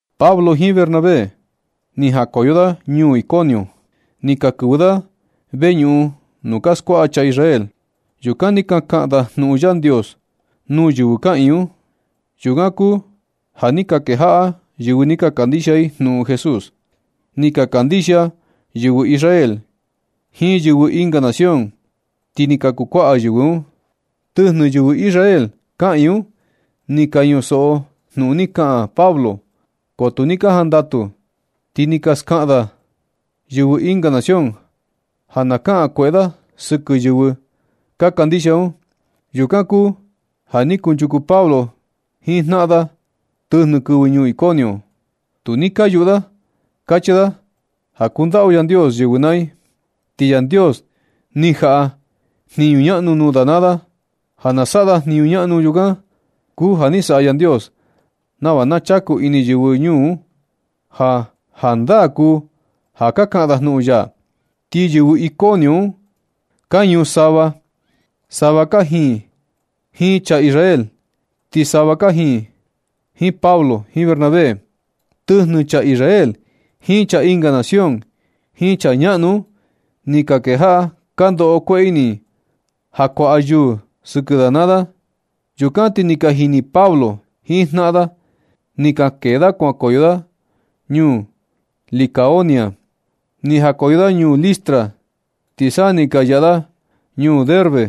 Pablo jiin Bernabé ni jakoyo da ñuu Iconio. Ni ka kɨvɨ da veñuꞌun nuu ka skuaꞌa chaa Israel. Yukan ni ka kaꞌan da jnuꞌun Yandios nuu yɨvɨ kaꞌiin un. Yukan kuu ja ni ka kejaꞌa yɨvɨ ni ka kandixia i jnuꞌun Jesús. Ni ka kandixia yɨvɨ Israel jiin yɨvɨ ɨnga nación, ti ni ka kuu kuaꞌa yɨvɨ un. Tɨjnɨ yɨvɨ Israel kaꞌiin un ni ka ñusoꞌo jnuꞌun ni kaꞌan Pablo, ko tu ni ka jandatu, ti ni ka skaꞌan da yɨvɨ ɨnga nación ja na kaꞌan kueꞌe da sɨkɨ yɨvɨ ka kandixia un. Yukan kuu ja ni kunchuku Pablo jiin jnaꞌan da tɨjnɨ kɨvɨ ñuu Iconio un. Tu ni ka yuꞌu da kachi da ja kundaꞌu Yandios yɨvɨ naa i. Ti Yandios ni jaꞌa jniñu ñaꞌnu nuu da naa da ja na saꞌa da jniñu ñaꞌnu. Yukan kuu ja ni saꞌa Yandios nava na chaku ini yɨvɨ ñuu un ja jandaa kuu ja ka kaꞌan da jnuꞌun ya. Ti yɨvɨ Iconio un ka ñuu sava. Sava kajiin jiin chaa Israel, ti sava kajiin Pablo jiin Bernabé. Tɨjnɨ chaa Israel jiin chaa ɨnga nación, jiin chaa ñaꞌnu un ni ka kejaꞌa ka ndoꞌo kueꞌe ini ja kuaꞌa yuu sɨkɨ da maa da. Yukan ti ni ka jini Pablo jiin jnaꞌan da. Ni ka kee da kuankoyo da ñuu Likaonia. Ni jakoyo da ñuu Listra, ti sa ni ka yaꞌa da ñuu Derbe.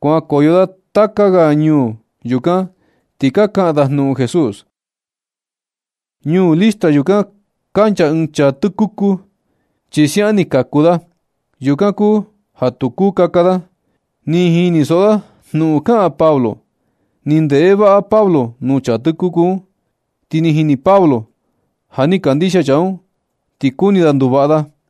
Kuankoyo da taka ga ñuu yukan, ti ka kaꞌan da jnuꞌun Jesús. Ñuu Listra yukan kancha ɨɨn chaa tɨkuku, chi siaꞌan ni kaku da. Yukan kuu ja tu kuu kaka da. Ni jinisoꞌo da jnuꞌun kaꞌan Pablo. Ni ndeꞌe vaꞌa Pablo nuu chaa tɨkuku un, ti ni jini Pablo ja ni kandixia chaa un, ti kuni da nduvaꞌa da.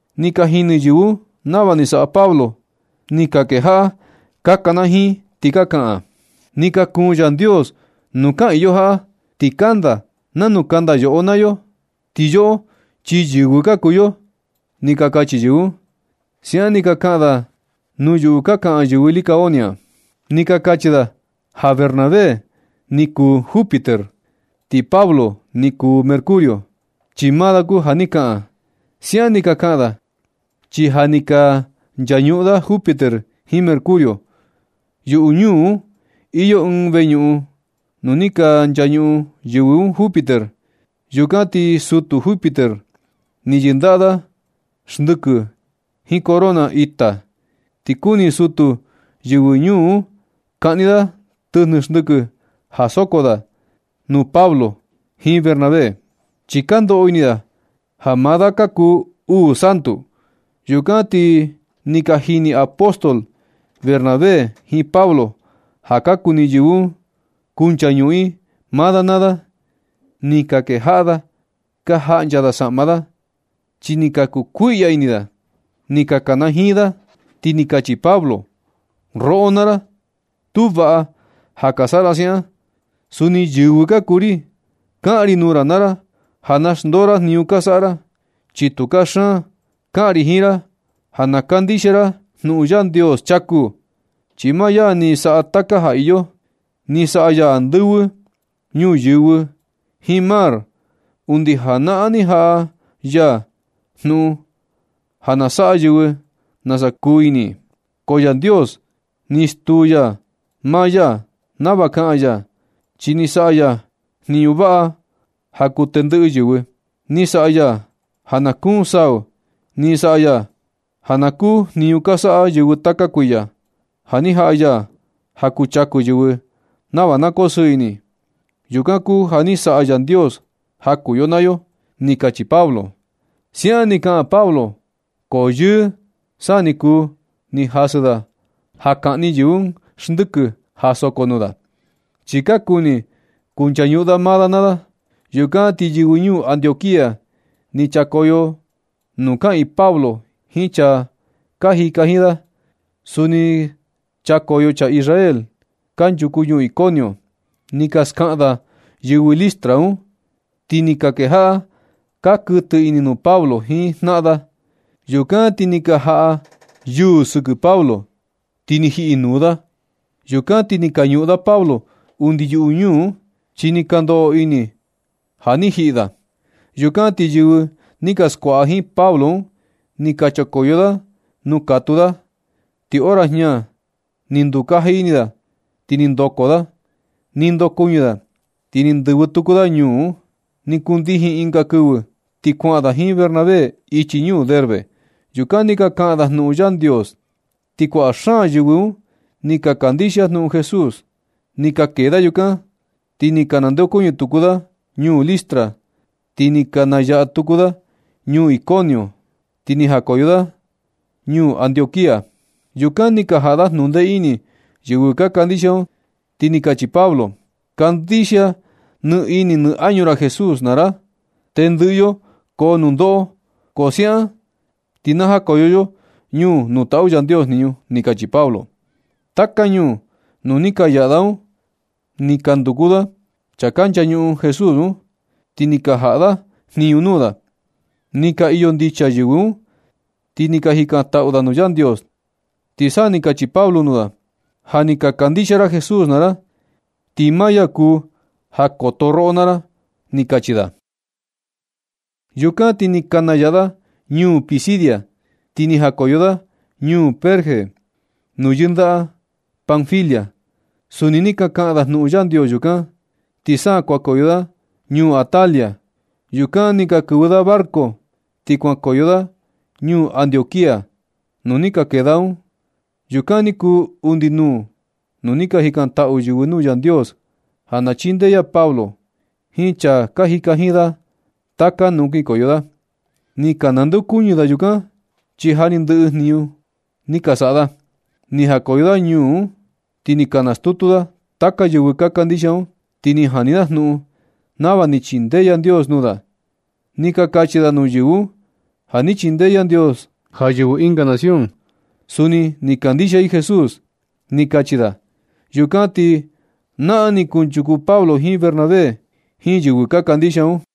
Ni ka jini yɨvɨ un nava ni saꞌa Pablo, ti ni ka kejaꞌa ka kanajiin, ti ka kaꞌan: ―¡Ni ka kuun Yandios nuu kaꞌiin yo jaꞌa, ti kanda nanu kanda yoꞌo naa yo. Ti yoꞌo chi yɨvɨ ka kuu yo! ―ni ka kachi yɨvɨ un. (Siaꞌan ni ka kaꞌan da nuu yuꞌu ka kaꞌan yɨvɨ Likaonia.) Ni ka kachi da ja Bernabé ni kuu Júpiter, ti Pablo ni kuu Mercurio, chi maa da kuu ja ni kaꞌan. Siaꞌan ni ka kaꞌan da, chi ja ni ka nchañuꞌun da Júpiter jiin Mercurio. Yuꞌu ñuu un iyo ɨɨn veñuꞌun nuu ni ka nchañuꞌun yɨvɨ un Júpiter. Yukan ti sutu Júpiter, ni yɨndaꞌa da xndɨkɨ jiin corona ita. Ti kuni sutu jiin yɨvɨ ñuu un kaꞌni da tɨjnɨ xndɨkɨ ja soko da tɨ nuu Pablo jiin Bernabé, chi ka ndoꞌo ini da ja maa da ka kuu uu santu. Yukan ti ni ka jini apóstol, Bernabé jiin Pablo ja ka kuni yɨvɨ un kunchañuꞌun i maa da naa da. Ni ka kejaꞌa da ka jaꞌncha da saꞌma da, chi ni ka kuu kuiꞌya ini da. Ni ka kanajiin da, ti ni kachi Pablo: ―Roꞌo naa ra, tu vaꞌa ja ka saꞌa ra siaꞌan. Suni yɨvɨ ka kuu ri. Kaꞌan ri nuu ra naa ra ja na xndoo ra jniñu ka saꞌa ra, chi tu kaxan. Kaꞌan ri jiin ra ja na kandixia ra nuu Yandios chaku, chi maa ya ni saꞌa taka ja iyo. Ni saꞌa ya andɨvɨ, ñuyɨvɨ jiin mar. Undi janaꞌan ni jaꞌa ya jnuꞌun ja na saꞌa yɨvɨ nasa kuu ini. Ko Yandios ni stuu ya maa ya nava kaa ya, chi ni saꞌa ya jniñu vaꞌa ja kuu tendɨꞌɨ yɨvɨ. Ni saꞌa ya ja na kuun sau, ni saꞌa ya ja na kuu jniñu ka saꞌa yɨvɨ taka kuiya, ja ni jaꞌa ya ja kuu chaku yɨvɨ nava na koo sɨɨ ini i. Yukan kuu ja ni saꞌa Yandios ja kuu yo naa yo ―ni kachi Pablo. Siaꞌan ni kaꞌan Pablo, ko yɨɨ sa ni kuu ni jasɨ da ja kaꞌni yɨvɨ un xndɨkɨ ja soko nuu da, chi ka kuni kunchañuꞌun da maa da naa da. Yukan ti yɨvɨ ñuu Antioquía ni chakoyo nuu kaꞌiin Pablo jiin chaa ka jika jiin da. Suni chakoyo chaa Israel kanchuku ñuu Iconio, ni ka skaꞌan da yɨvɨ Listra un, ti ni ka kejaꞌa ka kuɨtɨ ini nuu Pablo jiin jnaꞌa da. Yukan ti ni ka jaꞌa yuu sɨkɨ Pablo, ti ni jiꞌi nuu da. Yukan ti ni ka ñuꞌun da Pablo undi yuꞌu ñuu un, chi ni ka ndoꞌo ini ja ni jiꞌi da. Yukan ti yɨvɨ ni ka skuaꞌa jiin Pablo un ni chakoyo da nuu katuu da, ti hora jña ni ndukaji ini da ti ni ndoko da. Ni ndokuɨñɨ da, ti ni ndɨvɨ tuku da ñuu un. Ni kundijin ɨnga kɨvɨ, ti kuaꞌan da jiin Bernabé ichi ñuu Derbe. Yukan ni ka kaꞌan da jnuꞌun Yandios, ti kuaꞌa xaan yɨvɨ un ni ka kandixia jnuꞌun Jesús. Ni ka kee da yukan, ti ni ka nandeokuñɨ tuku da ñuu Listra. Ti ni ka nayaꞌa tuku da ñuu Iconio, ti ni najakoyo da ñuu Antioquía. Yukan ni ka jaꞌa da jnundee ini yɨvɨ ka kandixia un, ti ni kachi Pablo: ―Kandixia nɨ ini nɨ añu ra Jesús naa ra. Tendɨꞌɨ yo koo nundoꞌo, ko siaꞌan ti na jakoyo yo ñuu nuu taꞌu Yandios jniñu ―ni kachi Pablo. Taka ñuu nuu ni ka yaꞌa da un ni ka nduku da chaa nchañuꞌun Jesús un, ti ni ka jaꞌa da jniñu nuu da. Ni ka iyo ndicha yɨvɨ un, ti ni ka jikantaꞌu da nuu Yandios, ti sa ni kachi Pablo nuu da: ―Ja ni ka kandixia ra Jesús naa ra, ti maa ya kuu ja koto roꞌo naa ra ―ni kachi da. Yukan ti ni ka nayaꞌa da ñuu Pisidia, ti ni najakoyo da ñuu Perge nuu yɨndaꞌa Panfilia. Suni ni ka kaꞌan da jnuꞌun Yandios yukan, ti sa kuankoyo da ñuu Atalia. Yukan ni ka kɨvɨ da barco, ti kuankoyo da ñuu Antioquía nuu ni ka kee da un. Yukan ni kuu undi nuu nu ni ka jikantaꞌu yɨvɨ nuu Yandios ja na chindee ya Pablo jiin chaa ka jika jiin da taka nuu kinkoyo da. Ni ka nandeokuñɨ da yukan, chi ja ni ndɨꞌɨ jniñu da ni ka saꞌa da. Ni jakoyo da ñuu un, ti ni ka nastutu da taka yɨvɨ ka kandixia un, ti ni jani da jnuꞌun nava ni chindee Yandios nuu da. Ni ka kachi da nuu yɨvɨ un: ―Ja ni chindee Yandios ja yɨvɨ ɨnga nación, suni na kandixia i Jesús ―ni kachi da. Yukan ti naꞌan ni kunchuku Pablo jiin Bernabé jiin yɨvɨ ka kandixia un.